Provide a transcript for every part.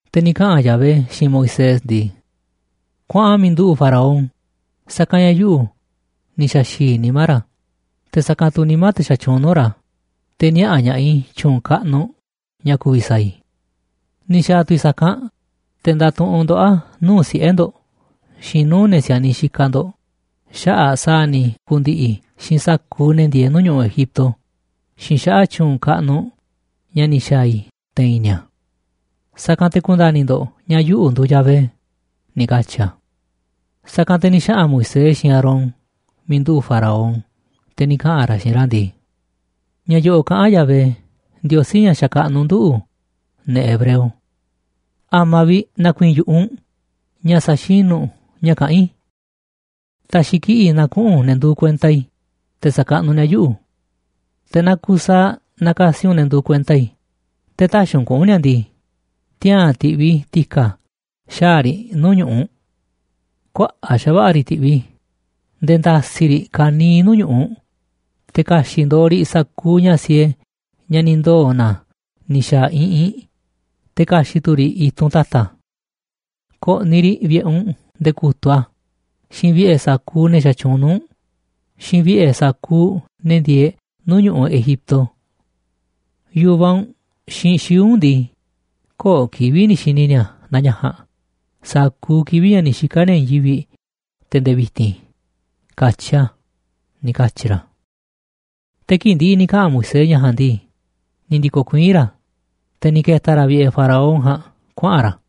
Te̱ ni̱ kaꞌa̱n Yahvé xiinꞌ Moisés ndii: ―Kuaꞌan miiꞌ nduꞌu̱ꞌ Faraón, sa̱kanꞌ ña̱ yuꞌu̱ ni̱ xa̱xi̱i̱ nimá ra̱, te̱ sa̱kanꞌ tu̱ nimá te̱ xatyuunꞌ nuu̱ꞌ ra̱, te̱ niaꞌa̱ ña̱ꞌaꞌ i̱ tyu̱u̱n kaꞌnuꞌ ña̱ ku̱vi̱ sa̱a̱ i̱. Ni̱ xa̱a̱ tu̱ i̱ sa̱kanꞌ te̱ nda̱tuꞌunꞌ ndoꞌó a̱ nuu̱ꞌ siꞌe̱ ndo̱ꞌ xiinꞌ nuu̱ꞌ ne̱ si̱a̱niꞌ xikaꞌ ndo̱ꞌ xaꞌa̱ꞌ sa̱a̱ ni̱ ku̱ndi̱ꞌi̱ i̱ xiinꞌ sa̱kuuꞌ ne̱ ndieeꞌ nuu̱ꞌ ñu̱ꞌuꞌ Egipto xiinꞌ xaꞌa̱ꞌ tyu̱u̱n kaꞌnuꞌ ña̱ ni̱ xa̱a̱ i̱ te̱i̱n ni̱a̱. Sa̱kanꞌ te̱ ku̱nda̱ni̱ ndo̱ꞌ ña̱ yuꞌu̱ nduuꞌ Yahvé ―ni̱ katyi̱ a̱. Sa̱kanꞌ te̱ ni̱ xaꞌa̱n Moisés xiinꞌ Aarón miiꞌ nduꞌu̱ꞌ Faraón, te̱ ni̱ kaꞌa̱n ra̱ xiinꞌ ra̱ ndii: ―Ña̱ yo̱ꞌo̱ꞌ kaꞌán Yahvé, Ndiosí, ña̱ xakaꞌnuꞌ nduꞌu̱, ne̱ hebreo: “¿A̱ma̱ vi̱ꞌ na̱ku̱i̱i̱n yu̱ꞌuꞌ u̱nꞌ ña̱ sa̱xinu̱ u̱nꞌ ña̱ kaꞌán i̱? Ta̱xi̱ kiꞌi̱ꞌ na kuꞌu̱n ne̱ nduuꞌ kuenta i̱ te̱ sa̱kaꞌnuꞌ ni̱a̱ yuꞌu̱. Te̱ naaꞌ kusaaꞌ nakasi u̱nꞌ ne̱ nduuꞌ kuenta i̱, te̱ tä̱xi̱ u̱nꞌ kuꞌu̱n ni̱a̱ ndii, tiaa̱n ti̱ꞌviꞌ i̱ ti̱ka̱ xaa̱ riꞌ nuu̱ꞌ ñu̱ꞌuꞌ u̱nꞌ. Kuaꞌa̱ꞌ xa̱va̱ꞌa̱ riꞌ ti̱ꞌviꞌ i̱ nde̱e̱ nda̱si̱ riꞌ ka̱niiꞌ nuu̱ꞌ ñu̱ꞌuꞌ, te̱ ka̱xi̱ꞌ ndooꞌ riꞌ sa̱kuuꞌ ña̱ siee ña̱ ni̱ ndoo̱ na ni̱ xa̱a̱ iꞌinꞌ, te̱ ka̱xi̱ꞌ tu̱ riꞌ i̱tunꞌ ta̱ta̱. Ko̱ꞌni̱ riꞌ vi̱ꞌe̱ u̱nꞌ nde̱e̱ ku̱tuꞌ a̱, xiinꞌ vi̱ꞌe̱ sa̱kuuꞌ ne̱ xatyuunꞌ nuu̱ꞌ u̱nꞌ, xiinꞌ vi̱ꞌe̱ sa̱kuuꞌ ne̱ ndieeꞌ nuu̱ꞌ ñu̱ꞌuꞌ Egipto. Yu̱vaꞌ u̱nꞌ xiinꞌ xii̱ꞌ u̱nꞌ ndii, köo̱ꞌ kivi̱ꞌ ni̱ xi̱ni̱ ni̱a̱ naa ña̱ ja̱a̱nꞌ sa̱kuuꞌ kivi̱ꞌ ña̱ ni̱ xika̱ ni̱a̱ i̱i̱n yivi̱ꞌ te̱ nde̱e̱ vi̱ti̱n”, katyi a̱ ―ni̱ katyi̱ ra̱. Te̱ kii̱ꞌ ndi̱ꞌi̱ ni̱ kaꞌa̱n Moisés ña̱ ja̱a̱nꞌ ndii, ni̱ ndi̱ko̱ kuiín ra̱, te̱ ni̱ ke̱ta̱ ra̱ vi̱ꞌe̱ Faraón ja̱a̱nꞌ kuaꞌa̱n ra̱.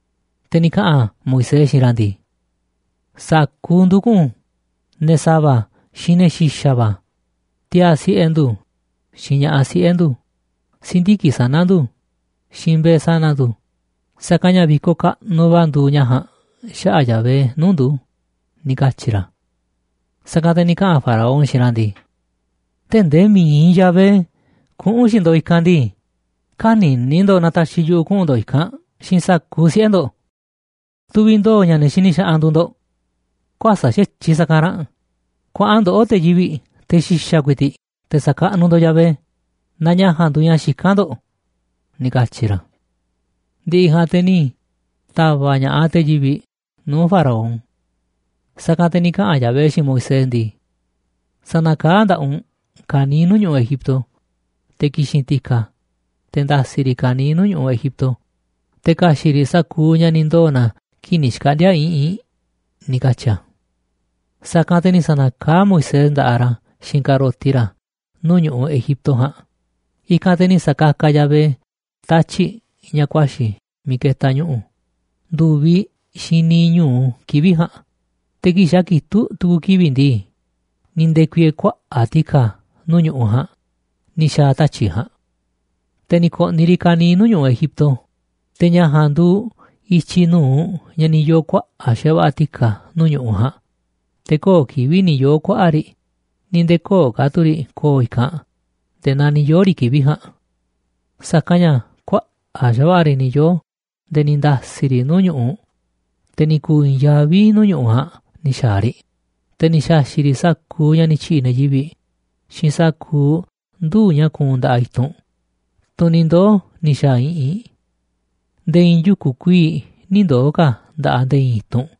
Te̱ ni̱ kaꞌa̱n Moisés xiinꞌ ra̱ ndii: ―Sa̱kuuꞌ ndu̱ kuꞌu̱n, ne̱ sa̱va̱, xiinꞌ ne̱ xi̱xa̱ va̱, tiaa̱ siꞌe̱ ndu̱, xiinꞌ ña̱ꞌaꞌ siꞌe̱ ndu̱, si̱ndiki̱ꞌ sana̱ ndu̱, xiinꞌ mbe̱e̱ sana̱ ndu̱, sa̱kanꞌ ña̱ vi̱koꞌ kaꞌnuꞌ va̱ nduuꞌ ña̱ ja̱a̱nꞌ xaꞌa̱ꞌ Yahvé nuu̱ꞌ ndu̱ ―ni̱ katyi̱ ra̱. Sa̱kanꞌ te̱ ni̱ kaꞌa̱n Faraón xiinꞌ ra̱ ndii: ―Tee̱ꞌ ndee mi̱iꞌ Yahvé kuꞌu̱n xiinꞌ ndo̱ꞌ i̱kanꞌ ndii, kä̱ni̱ni̱ ndo̱ꞌ na ta̱xi̱ yuꞌu̱ kuꞌu̱n ndo̱ꞌ i̱kanꞌ xiinꞌ sa̱kuuꞌ siꞌe̱ ndo̱ꞌ. Tuviꞌ ndooꞌ ña̱ ne̱ xini xaꞌanꞌ nduuꞌ ndo̱ꞌ. Kuäsa̱ꞌ xa̱tyiꞌ sa̱kanꞌ ra̱nꞌ, kuaꞌan ndoꞌó, te̱ yivi̱ꞌ, te̱ xi̱xa̱ ku̱i̱ti̱ꞌ, te̱ sa̱kaꞌnuꞌ ndo̱ꞌ Yahvé naaꞌ ña̱ ja̱a̱nꞌ nduuꞌ ña̱ xikán ndo̱ꞌ ―ni̱ katyi̱ ra̱. Ndi̱ꞌi̱ ja̱a̱nꞌ te̱ ni̱ ta̱va̱ꞌ ña̱ꞌaꞌ te̱ yivi̱ꞌ nuu̱ꞌ Faraón. Sa̱kanꞌ te̱ ni̱ kaꞌa̱n Yahvé xiinꞌ Moisés ndii: ―Sa̱na̱kaá nda̱ꞌaꞌ u̱nꞌ ka̱niiꞌ nuu̱ꞌ ñu̱ꞌuꞌ Egipto, te̱ ki̱xi̱n ti̱ka̱, te̱ nda̱si̱ riꞌ ka̱niiꞌ nuu̱ꞌ ñu̱ꞌuꞌ Egipto, te̱ ka̱xi̱ꞌ riꞌ sa̱kuuꞌ ña̱ ni̱ ndoo̱ na kii̱ꞌ ni̱ xkaꞌndi̱a̱ iꞌinꞌ ―ni̱ katyi̱ a̱. Sa̱kanꞌ te̱ ni̱ sa̱na̱kaá Moisés nda̱ꞌaꞌ ra̱ xiinꞌ ka̱roti ra̱ nuu̱ꞌ ñu̱ꞌuꞌ Egipto ja̱a̱nꞌ, i̱kanꞌ te̱ ni̱ sa̱kakaꞌ Yahvé tatyi̱ꞌ ña̱ ku̱a̱xi̱ miiꞌ ketaꞌ ñu̱ꞌu̱ ndu̱viꞌ xiinꞌ niiꞌ ñu̱u kivi̱ꞌ ja̱a̱nꞌ, te̱ kii̱ꞌ xa̱ kitúꞌ tu̱ku̱ kivi̱ꞌ ndii, ni̱ nde̱ku̱i̱e̱e̱ kuaꞌa̱ꞌ ti̱ka̱ nuu̱ꞌ ñu̱ꞌuꞌ ja̱a̱nꞌ ni̱ xa̱a̱ tatyi̱ꞌ ja̱a̱nꞌ. Te̱ ni̱ ko̱ꞌni̱ riꞌ ka̱niiꞌ nuu̱ꞌ ñu̱ꞌuꞌ Egipto, te̱ ña̱ ja̱a̱nꞌ nduuꞌ i̱tyiꞌ nu̱uꞌ ña̱ ni̱ yoo̱ kuaꞌa̱ꞌ xa̱va̱ꞌa̱ ti̱ka̱ nuu̱ꞌ ñu̱ꞌuꞌ ja̱a̱nꞌ, te̱ köo̱ꞌ kivi̱ꞌ ni̱ yoo̱ kuaꞌa̱ꞌ riꞌ ni̱ nde̱e̱ köo̱ꞌ ka̱ tu̱ riꞌ ko̱o̱ i̱kanꞌ nde̱e̱ naa ni̱ yoo̱ riꞌ kivi̱ꞌ ja̱a̱nꞌ. Sa̱kanꞌ ña̱ kuaꞌa̱ꞌ xa̱va̱ꞌa̱ riꞌ ni̱ yoo̱ nde̱e̱ ni̱ nda̱si̱ riꞌ nuu̱ꞌ ñu̱ꞌu̱, te̱ ni̱ ku̱u̱ i̱i̱n yaví nuu̱ꞌ ñu̱ꞌuꞌ ja̱a̱nꞌ ni̱ xa̱a̱ riꞌ, te̱ ni̱ xa̱xi̱ꞌ riꞌ sa̱kuuꞌ ña̱ ni̱ tyi̱ꞌi̱ ne̱ yivi̱ꞌ xiinꞌ sa̱kuuꞌ nduu̱ꞌ ña̱ kuunꞌ nda̱ꞌaꞌ i̱tunꞌ, tunꞌ ni̱ ndoo̱ ni̱ xa̱a̱ iꞌinꞌ. Nde̱e̱ i̱i̱n yuku̱ kuii̱ꞌ nï̱ ndoo̱ ka̱ nda̱ꞌaꞌ nde̱e̱ i̱i̱n i̱tunꞌ,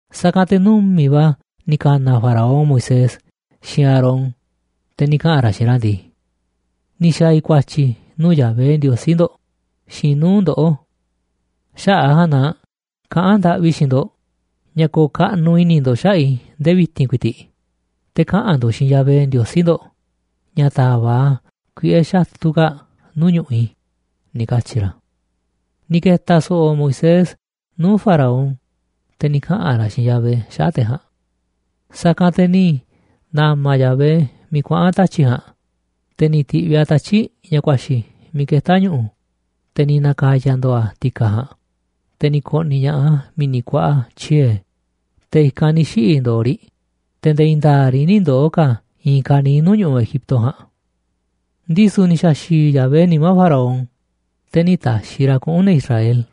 Sa̱kanꞌ te̱ numi̱ꞌ va̱ ni̱ ka̱na̱ Faraón Moisés xiinꞌ Aarón, te̱ ni̱ kaꞌa̱n ra̱ xiinꞌ ra̱ ndii: ―Ni̱ xa̱a̱ i̱ ku̱a̱tyi̱ nuu̱ꞌ Yahvé Ndiosí ndo̱ꞌ xiinꞌ nuu̱ꞌ ndoꞌó. Xaꞌa̱ꞌ a̱ ja̱a̱nꞌ na kaꞌán ndaꞌvi i̱ xiinꞌ ndo̱ꞌ ña̱ ko̱o̱ kaꞌnuꞌ i̱ni̱ ndo̱ꞌ xaꞌa̱ꞌ i̱ ndee vi̱ti̱n ku̱i̱ti̱ꞌ, te̱ kaꞌa̱n ndo̱ꞌ xiinꞌ Yahvé Ndiosí ndo̱ꞌ na ta̱va̱ꞌ a̱ kuiꞌe̱ xatu̱ kaa̱ꞌ nuu̱ꞌ ñu̱ꞌuꞌ i̱ ―ni̱ katyi̱ ra̱. Ni̱ ke̱ta̱ so̱ꞌo̱ Moisés nuu̱ꞌ Faraón, te̱ ni̱ kaꞌa̱n ra̱ xiinꞌ Yahvé xaꞌa̱ꞌ te̱ ja̱a̱nꞌ. Sa̱kanꞌ te̱ ni̱ na̱ma̱ Yahvé miiꞌ kuaꞌa̱n tatyi̱ꞌ ja̱a̱nꞌ, te̱ ni̱ ti̱ꞌviꞌ a̱ tatyi̱ꞌ ña̱ ku̱a̱xi̱ miiꞌ ketá ñu̱ꞌu̱, te̱ ni̱ na̱ka̱ya̱ ndo̱o̱ a̱ ti̱ka̱ ja̱a̱nꞌ, te̱ ni̱ ko̱ꞌni̱ ña̱ꞌaꞌ a̱ mi̱ni̱ kuaꞌa tyiee̱, te̱ i̱kanꞌ ni̱ xiꞌi̱ ndo̱o̱ riꞌ, te̱ nde̱e̱ i̱i̱n nda̱a̱ꞌ riꞌ nï̱ ndoo̱ ka̱ i̱i̱n ka̱niiꞌ nuu̱ꞌ ñu̱ꞌuꞌ Egipto ja̱a̱nꞌ. Ndisu̱ ni̱ sa̱xi̱i̱ Yahvé nimá Faraón, te̱ nï̱ ta̱xi̱ ra̱ kuꞌu̱n ne̱ Israel.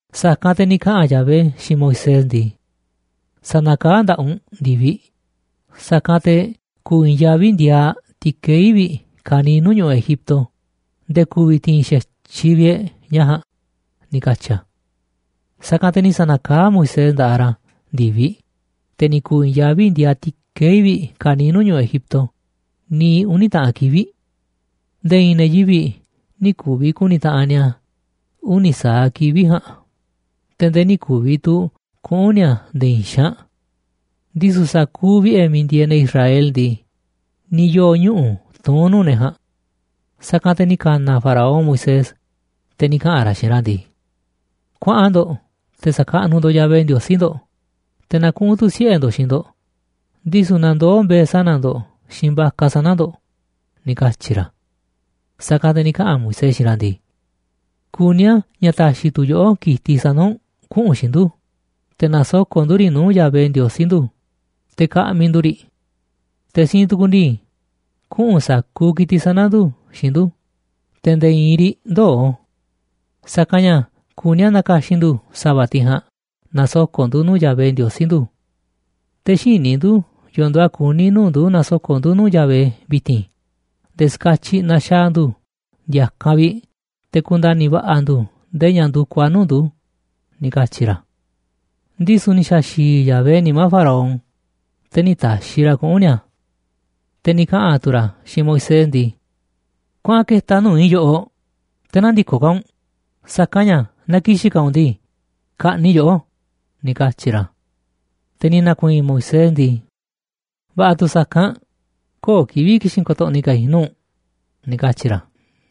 Sa̱kanꞌ te̱ ni̱ kaꞌa̱n Yahvé xiinꞌ Moisés ndii: ―Sa̱na̱kaá nda̱ꞌaꞌ u̱nꞌ ndi̱viꞌ, sa̱kanꞌ te̱ ku̱u̱ i̱i̱nyaví ndiaaꞌ ti̱kei̱ vi̱ꞌ ka̱niiꞌ nuu̱ꞌ ñu̱ꞌuꞌ Egipto nde̱e̱ ku̱vi̱ ti̱i̱n xa̱tyiꞌ vi̱ꞌ e̱ꞌ ña̱ ja̱a̱nꞌ ―ni̱ katyi̱ a̱. Sa̱kanꞌ te̱ ni̱ sa̱na̱kaá Moisés nda̱ꞌaꞌ ra̱ ndi̱viꞌ, te̱ ni̱ ku̱u̱ i̱i̱nyaví ndiaaꞌ ti̱kei̱ vi̱ꞌ ka̱niiꞌ nuu̱ꞌ ñu̱ꞌuꞌ Egipto niiꞌ uni̱ taꞌan kivi̱ꞌ. Nde̱e̱ i̱i̱n ne̱ yivi̱ꞌ nï̱ ku̱vi̱ ku̱ni̱ taꞌanꞌ ni̱a̱ uni̱ sa̱aꞌ kivi̱ꞌ ja̱a̱nꞌ, te̱ nde̱e̱ nï̱ ku̱vi̱ tu̱ kuꞌu̱n ni̱a̱ nde̱e̱ i̱i̱n xaanꞌ. Ndisu̱ sa̱kuuꞌ vi̱ꞌe̱ miiꞌ ndieeꞌ ne̱ Israel ndii, ni̱ yoo̱ ñuꞌu̱ tuún nuu̱ꞌ ne̱ ja̱a̱nꞌ. Sa̱kanꞌ te̱ ni̱ ka̱na̱ Faraón Moisés, te̱ ni̱ kaꞌa̱n ra̱ xiinꞌ ra̱ ndii: ―Kuaꞌan ndo̱ꞌ te̱ sa̱kaꞌnuꞌ ndo̱ꞌ Yahvé, Ndiosí ndo̱ꞌ, te̱ na kuꞌu̱n tu̱ siꞌe̱ ndo̱ꞌ xiinꞌ ndo̱ꞌ, ndisu̱ na ndoo̱ mbe̱e̱ sana̱ ndo̱ꞌ xiinꞌ vaca sana̱ ndo̱ꞌ ―ni̱ katyi̱ ra̱. Sa̱kanꞌ te̱ ni̱ kaꞌa̱n Moisés xiinꞌ ra̱ ndii: ―Kuní a̱ ña̱ ta̱xi̱ tu̱ yoꞌó ki̱tiꞌ sana̱ u̱nꞌ kuꞌu̱n xiinꞌ ndu̱, te̱ na̱soko̱ꞌ ndu̱ riꞌ nuu̱ꞌ Yahvé Ndiosí ndu̱, te̱ ka̱ꞌmi̱ ndu̱ riꞌ. Te̱ siinꞌ tukuꞌ ndii, kuꞌu̱n sa̱kuuꞌ ki̱tiꞌ sana̱ ndu̱ xiinꞌ ndu̱, te̱ nde̱e̱ i̱i̱n riꞌ ndöo̱, sa̱kanꞌ ña̱ kuní a̱ na̱ka̱xi̱n ndu̱ sa̱va̱ tiꞌ ja̱a̱nꞌ na̱soko̱ꞌ ndu̱ nuu̱ꞌ Yahvé, Ndiosí ndu̱. Te̱ xïní ndu̱ yo̱o̱ nduuꞌ a̱ kuni̱ nuu̱ꞌ ndu̱ na̱soko̱ꞌ ndu̱ nuu̱ꞌ Yahvé vi̱ti̱n nde̱e̱ ska̱tyiꞌ na̱xaa̱ ndu̱ ndi̱a̱kanꞌ vi̱ꞌ te̱ ku̱nda̱ni̱ va̱ꞌa̱ ndu̱ ndee ña̱ ndu̱kuꞌ a̱ nuu̱ꞌ ndu̱ ―ni̱ katyi̱ ra̱. Ndisu̱ ni̱ sa̱xi̱i̱ Yahvé nimá Faraón, te̱ nï̱ ta̱xi̱ ra̱ kuꞌu̱n ni̱a̱. Te̱ ni̱ kaꞌa̱n tu̱ ra̱ xiinꞌ Moisés ndii: ―Kuaꞌan ke̱ta̱ nuu̱ꞌ i̱ yoꞌoꞌ, te̱ nä̱ndi̱koꞌ ka̱ u̱nꞌ, sa̱kanꞌ ña̱ naaꞌ ki̱xi̱n ka̱ u̱nꞌ ndii, ka̱ꞌni̱ꞌ i̱ yoꞌó ―ni̱ katyi̱ ra̱. Te̱ ni̱ na̱ku̱i̱i̱n Moisés ndii: ―Va̱ꞌa̱ tu̱ sa̱kanꞌ, köo̱ꞌ kivi̱ꞌ ki̱xi̱n ko̱to̱ꞌni̱ ka̱ i̱ nuu̱ꞌ u̱nꞌ ―ni̱ katyi̱ ra̱.